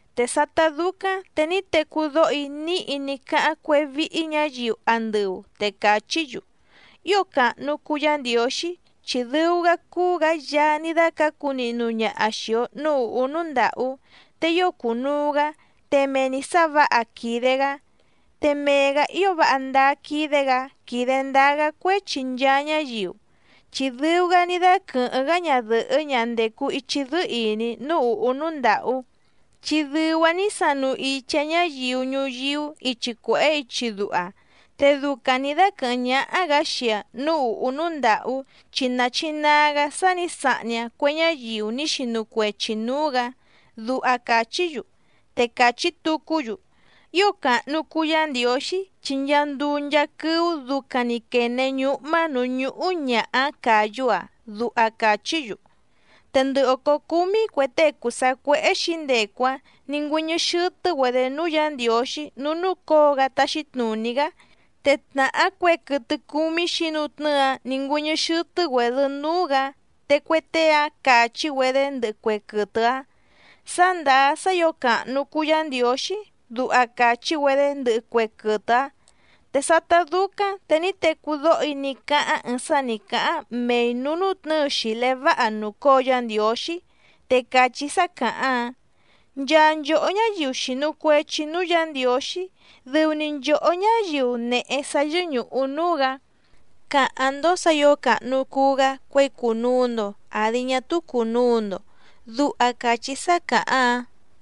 Te sátá dúcáⁿ te ní tecú dóho‑í níhi ní cáháⁿ cuéhé víhí ñǎyiu andɨu, te càchí‑yu: ¡Ío càhnu cuu Yá Ndiǒxí!, chi dɨu‑gá cúú‑gǎ Yaá ní dácǎcu nihnu ñaha xìi‑o núú ùhú núú ndàhú, te ío cùnuu‑gá, te mee‑ni sǎ vǎha quìde‑gá, te mee‑gǎ ío váha ndáá quídé‑gǎ quídé ndǎá‑gá cuéchi nchaa ñáyiu, chi dɨu‑gá ní dáquɨ̀hɨ́ⁿ‑gá ñadɨ̀hɨ́ ñaha ndècu ichi dɨ́ɨ́ ìní núú ùhú núú ndàhú, chi dɨu‑aⁿ ní sanu ichi‑aⁿ ñáyiu ñuyíú ichi cuèhé ichi duha, te ducaⁿ nǐ dáquɨ̀hɨ́ⁿ ñáhá‑gǎ xii‑aⁿ núú ùhú núú ndàhú chi nàchinaa‑gá sá nǐ sahni‑aⁿ cue ñáyiu ní xinu cuechi nǔú‑gǎ. Duha càchí‑yu. Te càchí tucú‑yu: —¡Ío càhnu cuu Yá Ndiǒxí!, chi nchaa nduu nchaa quɨ́ú ducaⁿ‑ni quène ñúhmá nǔú ñúhú ñàha‑áⁿ càyú‑aⁿ —duha càchí‑yu. Te ndɨ òcó cúmí cue tée cùu sacuéhé xǐndecu‑áⁿ nǐ ngüɨ́ñɨ́ xɨ́tɨ́‑güedě núú Yǎ Ndiǒxí núú núcǒo‑gá táxí tnùní‑gá, te tnàhá cue quɨtɨ cúmí xǐnutnɨ́ɨ‑áⁿ nǐ ngüɨ́ñɨ́ xɨ́tɨ́‑güèdɨ núú‑gǎ, te cue tée‑áⁿ càchí‑güedé ndɨhɨ cue quɨtɨ‑áⁿ: —Sá ndàá sá ǐo càhnu cuu Yá Ndiǒxí —duha càchí‑güedé ndɨhɨ cue quɨtɨ‑áⁿ. Te sátá dúcáⁿ te ní tecú dóho‑í ní cáháⁿ ɨɨⁿ sá nǐ cáháⁿ mei nǔú nútnɨ̌ɨ xìlé váha nùcóo Yá Ndiǒxí, te càchí sá càháⁿ‑áⁿ: Nchaa nchòhó ñáyiu xìnu cuechi núú Yǎ Ndiǒxí, dɨu‑ni nchòhó ñáyiu nèhe sá yɨ́ñùhu núú‑gǎ, càháⁿ‑ndó sǎ ǐo càhnu cuu‑gá cuěi cùnuu‑ndo àdi ñá túú cùnuu‑ndo. Duha càchí sá càháⁿ‑áⁿ.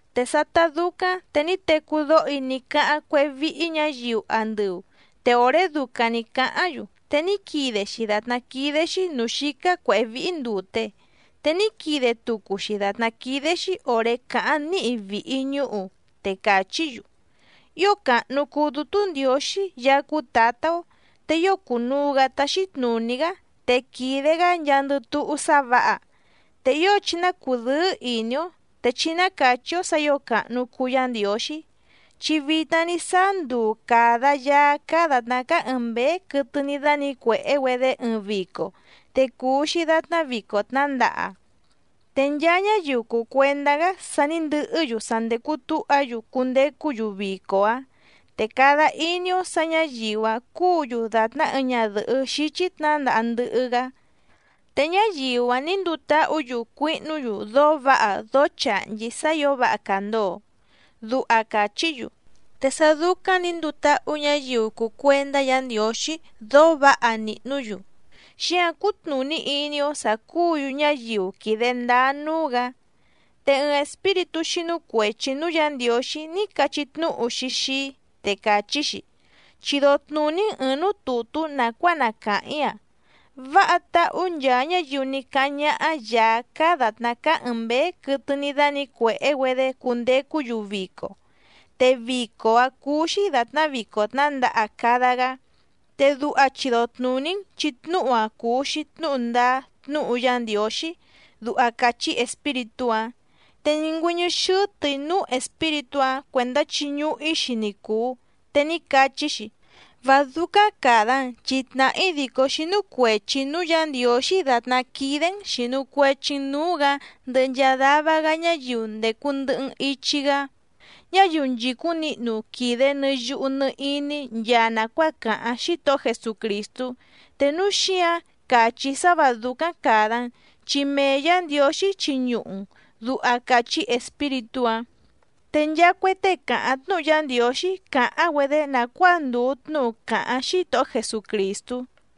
Te sátá dúcáⁿ te ní tecú dóho‑í ní cáháⁿ cuéhé víhí ñǎyiu andɨu, te òré ducaⁿ nǐ cáháⁿ‑yu te ní quide‑xi dàtná quídé‑xí nǔú xícá cuěhé víhí ndùte, te ní quide tucu‑xi dàtná quídé‑xí òré càháⁿ níhi vìhi ñúhu, te càchí‑yu: ¡Ío càhnu cuu Dútú Ndiǒxí Yaá cúú Tǎtá‑ó! Te ío cùnuu‑gá táxí tnùní‑gá, te quìde‑gá nchaandɨ túhú sá vǎha. Te ío chí ná cùdɨ́ɨ́ ìní‑ó, te chí ná càchí‑ó sǎ ǐo càhnu cuu Yá Ndiǒxí, chi vitna ní sáá nduu càda Yaá cáá dàtná cáá ɨ̀ɨⁿ mbéé quɨtɨ ní dánǐcuèhé‑güedé ɨɨⁿ vico, te cùu‑xi datná vico tnǎndaha. Te nchaa ñáyiu cùu cuendá‑gá sa ní ndɨhɨ́‑yu sa ndècu túha‑yu cundecú‑yu vico‑áⁿ, te cada iní‑ó sǎ ñǎyiu‑áⁿ cúǔ‑yu dàtná ɨɨⁿ ñadɨ̀hɨ́ xíchí tnǎndaha ndɨhɨ‑gá, te ñáyiu‑áⁿ nǐ nduu táhǔ‑yu cuihnú‑yu dóó vǎha dóó chàhnchí sá ǐo váha càndoo. Duha càchí‑yu. Te sá dúcáⁿ nǐ nduu táhú ñǎyiu cùu cuendá Yǎ Ndiǒxí dóó vǎha nìhnú‑yu, xíǎⁿ cútnùní iní‑ó sǎ cúǔ‑yu ñáyiu quìde ndáá núú‑gǎ. Te ɨɨⁿ espíritú xínú cuèchi núú Yǎ Ndiǒxí ní cachí tnúhu‑xi xii‑í, te càchí‑xi: —Chido tnùní‑n ɨ̀ɨⁿ núú tùtú nàcuáa na càháⁿ‑í‑a: “Váha táhú nchaa ñáyiu ní cáháⁿ ñáhá Yàá cáá dàtná cáá ɨ̀ɨⁿ mbéé quɨtɨ ní dánǐcuèhé‑güedé cundecú‑yu vico, te vico‑áⁿ cúú‑xí dàtná vico tnǎndaha cada‑gá”, te duha chido tnùní‑n chi tnúhu‑a cùu‑xi tnúhu ndáá tnúhu Yá Ndiǒxí —duha càchí espíritú‑áⁿ. Te ní ngüɨ́ñɨ́ xɨ́tɨ̀‑í núú espíritú‑áⁿ cuèndá chiñuhu‑í‑xi ni cùu, te ní cachí‑xi: —Vá dúcáⁿ càda‑n, chi tnàhá‑í dìcó xínú cuèchi‑í núú Yǎ Ndiǒxí dàtná quídé‑n xìnu cuechi‑n núú‑gǎ ndɨhɨ nchaa dava‑gá ñáyiu ndècu ndɨhɨ‑n ichi‑gá, ñáyiu nchìcúⁿ nihnu quìde nɨ yuhu nɨ iní nchaa nàcuáa càháⁿ Xítohó Jesucrìstú, te núu xíǎⁿ càchí‑í sá vǎ dúcáⁿ càda‑n, chi mee Yǎ Ndiǒxí chiñuhu‑n —duha càchí espíritú‑áⁿ. Te nchaa cue tée càháⁿ tnúhu Yá Ndiǒxí càháⁿ‑güedé nàcuáa ndùu tnúhu càháⁿ Xítohó Jesucrìstú.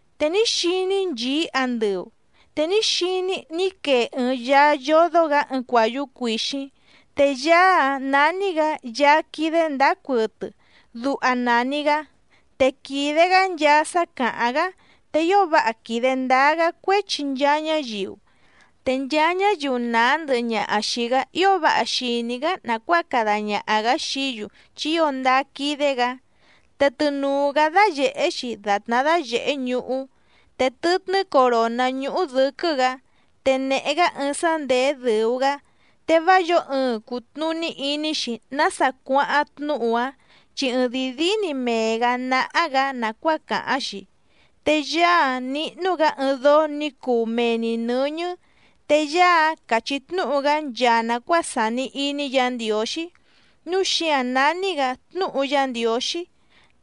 Te ní xiní‑í nchìí andɨu, te ní xiní‑í ní quee ɨɨⁿ Yaá yódó‑gǎ ɨɨⁿ cuàyú cuìxíⁿ. Te Yaá‑áⁿ nání‑gǎ Yaá quídé ndǎá cuɨtɨ, duha nàni‑gá. Te quìde‑gá nchaa sá càháⁿ‑gá, te ío váha quìde ndáá‑gá cuéchi nchaa ñáyiu, te nchaa ñáyiu nàá ndɨhɨ ñaha xìi‑gá ío váha xìní‑gá nàcuáa cada ñaha‑gǎ xií‑yu chi ío ndáá quídé‑gǎ. Te tɨnùu‑gá dáyèhé‑xi dàtná dáyèhé ñuhú, te tɨtnɨ́ coròná ñúhú dɨ̌quɨ́‑gǎ, te nèhe‑gá ɨɨⁿ sá ndèé dɨ̀u‑gá, te vá yǒo ɨɨⁿ cùtnuní iní‑xi nása cuáháⁿ tnúhu‑áⁿ, chi ɨɨⁿdìi díí‑ni mee‑gǎ náhá‑gǎ nàcuáa càháⁿ‑xi. Te Yaá‑áⁿ níhnú‑gǎ ɨɨⁿ dóó nǐ cuu mee‑ni nɨ̌ñɨ́, te Yaá‑áⁿ càchí tnúhu‑gá nchaa nàcuáa sàni iní Yǎ Ndiǒxí, núu xíǎⁿ nání‑gǎ Tnúhu Yá Ndiǒxí.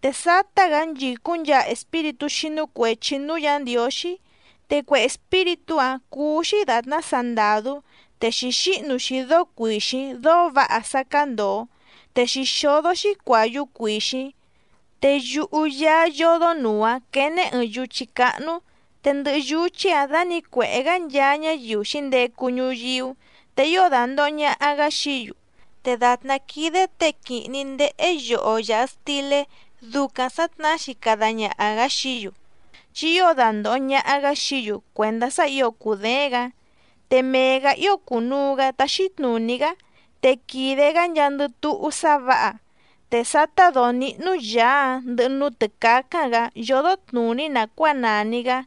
Te sátá‑gǎ nchìcúⁿ nchaa espíritú xínú cuèchi núú Yǎ Ndiǒxí, te cue espíritú‑áⁿ cúú‑xí dàtná sandàdú, te xǐxíhnu‑xi dóó cuìxíⁿ dóó vǎha sá cándòo, te xǐxódó‑xi cuàyú cuìxíⁿ. Te yuhu Yaá yódónùu‑áⁿ quéné ɨ̀ɨⁿ yuchí cáhnú, te ndɨhɨ yuchí‑áⁿ dànícuèhé‑gá nchaa ñáyiu xǐndecu ñuyíú, te ío dandòho ñaha‑gá xií‑yu, te dàtná quídé těe quìhni ndéhé yoho yàha stilé ducaⁿ sǎtnahá‑xi cada ñaha‑gǎ xií‑yu, chi ío dandòho ñaha‑gá xií‑yu cuèndá sá ǐo cùdééⁿ‑gǎ. Te mee‑gǎ ío cùnuu‑gá táxí tnùní‑gá, te quìde‑gá nchaandɨ túhú sá vǎha. Te sátá dǒó níhnú Yàá‑áⁿ ndɨhɨ núú tɨ̀cácáⁿ‑gǎ yódó tnùní nàcuáa nàni‑gá,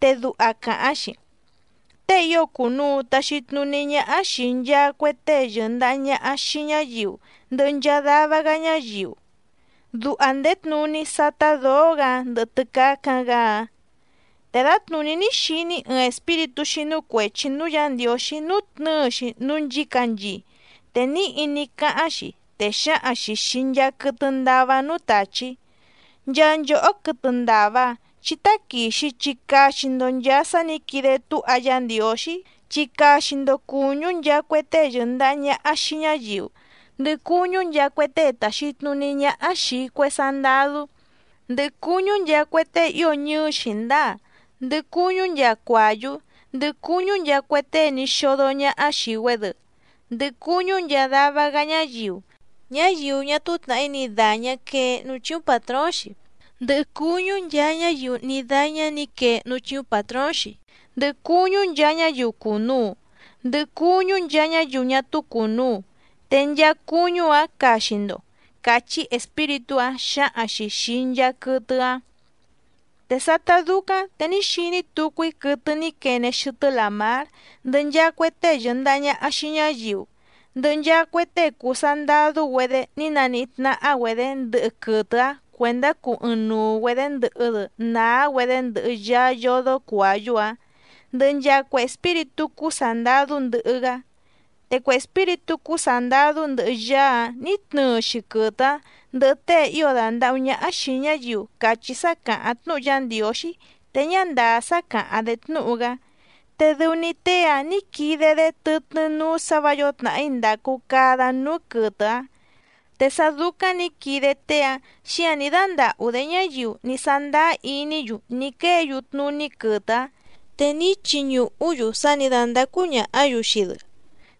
te duha càháⁿ‑xi: “Tée ío cùnuu taxi tnuní ñáhá xìi nchaa cue tée yɨ̀ndaha ñaha xii ñáyiu ndɨhɨ nchaa dava‑gá ñáyiu”, duha ndèé tnuní sátá dǒó‑gǎ‑áⁿ ndɨhɨ tɨ́cácáⁿ‑gǎ‑áⁿ. Te dǎtnùní ní xiní‑í ɨɨⁿ espíritú xínú cuèchi núú Yǎ Ndiǒxí nútnɨ̌ɨ‑xi núú nchǐcanchii, te níhi ní cáháⁿ‑xi, te xǎhaⁿ‑xi xìi nchaa quɨtɨ ndava núú tàchí: —Nchaa nchòhó quɨtɨ ndàva, chí táquìxi chi caxi‑ndo nchàa sá nǐ quide túha Yá Ndiǒxí, chi caxi‑ndo cùñú nchaa cue tée yɨ̀ndaha ñaha xii ñáyiu, ndɨhɨ cuñú nchaa cue tée tàxi tnuní ñáhá xìi cue sandadú, ndɨhɨ cuñú nchaa cue tée ío ñɨɨ́ xǐndáa, ndɨhɨ cuñú nchaa cuàyú, ndɨhɨ cuñú nchaa cue tée ní xódó ñaha xii‑güedɨ, ndɨhɨ cuñú nchaa dava‑gá ñáyiu, ñáyiu ñá túú tnàhí ni dàñá quee núú chíúⁿ pàtróóⁿ‑xi, ndɨhɨ cuñú nchaa ñáyiu ní dáñá nǐ quee núú chíúⁿ pàtróóⁿ‑xi, ndɨhɨ cuñú nchaa ñáyiu cùnuu, ndɨhɨ cuñú nchaa ñáyiu ñá túú cùnuu, te nchaa cuñú‑áⁿ caxi‑ndo —càchí espíritú‑áⁿ xǎhaⁿ‑xi xìi nchaa quɨtɨ‑áⁿ. Te sátá dúcáⁿ te ní xiní tucu‑í quɨtɨ ní quene xɨtɨ́ làmár, ndɨhɨ nchaa cue tée yɨ̀ndaha ñaha xii ñáyiu, ndɨhɨ nchaa cue tée cùu sandadú‑güedé ní naníhí tnáhá‑güedě ndɨhɨ quɨtɨ‑áⁿ cuèndá cuu ɨɨⁿnuu‑güedě ndɨhɨ‑dɨ nàá‑güedé ndɨhɨ Yaá yódó cuàyú‑áⁿ, ndɨhɨ nchaa cue espíritú cúú sàndadú ndɨhɨ‑gá. Te cue espíritú cúú sàndadú ndɨhɨ Yaá‑áⁿ nǐ tnɨɨ‑xi quɨtɨ‑áⁿ, ndɨhɨ tée ío dàndahú ñáhá xìi ñáyiu càchí sá càháⁿ tnúhu Yá Ndiǒxí te ñá ndàá sá càháⁿ‑dé tnúhu‑gá, te dɨu‑ni tée‑áⁿ nǐ quide‑dé tɨtnɨ́ núú sǎ vǎ yǒo tnàhí ndàcu cada núú quɨtɨ‑áⁿ. Te sá dúcáⁿ nǐ quide tée‑áⁿ xíǎⁿ ní dándàhú‑dé ñáyiu ní sándáá iní‑yu ní quéě‑yu tnuní quɨtɨ‑áⁿ, te ní chiñùhú‑yu sá nǐ dándácú ñàhá‑yu xii‑dɨ,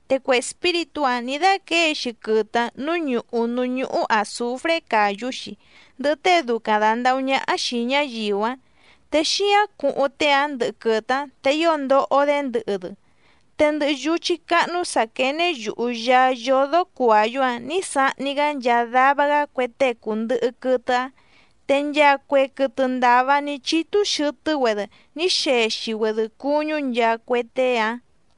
te cue espíritú‑áⁿ nǐ dáquěe‑xi quɨtɨ‑áⁿ nǔú ñùhú núú ñúhú àzufré càyú‑xi, ndɨhɨ tée ducaⁿ dàndahú ñáhá xìi ñáyiu‑áⁿ, te xíáⁿ cuhuⁿ tée‑áⁿ ndɨhɨ quɨtɨ‑áⁿ, te ío ndoho‑dé ndɨhɨ‑dɨ. Te ndɨhɨ yuchí cáhnú sǎ quéné yùhu Yaá yódó cuàyú‑áⁿ nǐ sahni‑gá nchaa dava‑gá cue tée cùndɨhɨ quɨtɨ‑áⁿ, te nchaa cue quɨtɨ ndàva ní chítú xɨ̀tɨ́‑güedɨ ní xexi‑güedɨ cuñú nchaa cue tée‑áⁿ.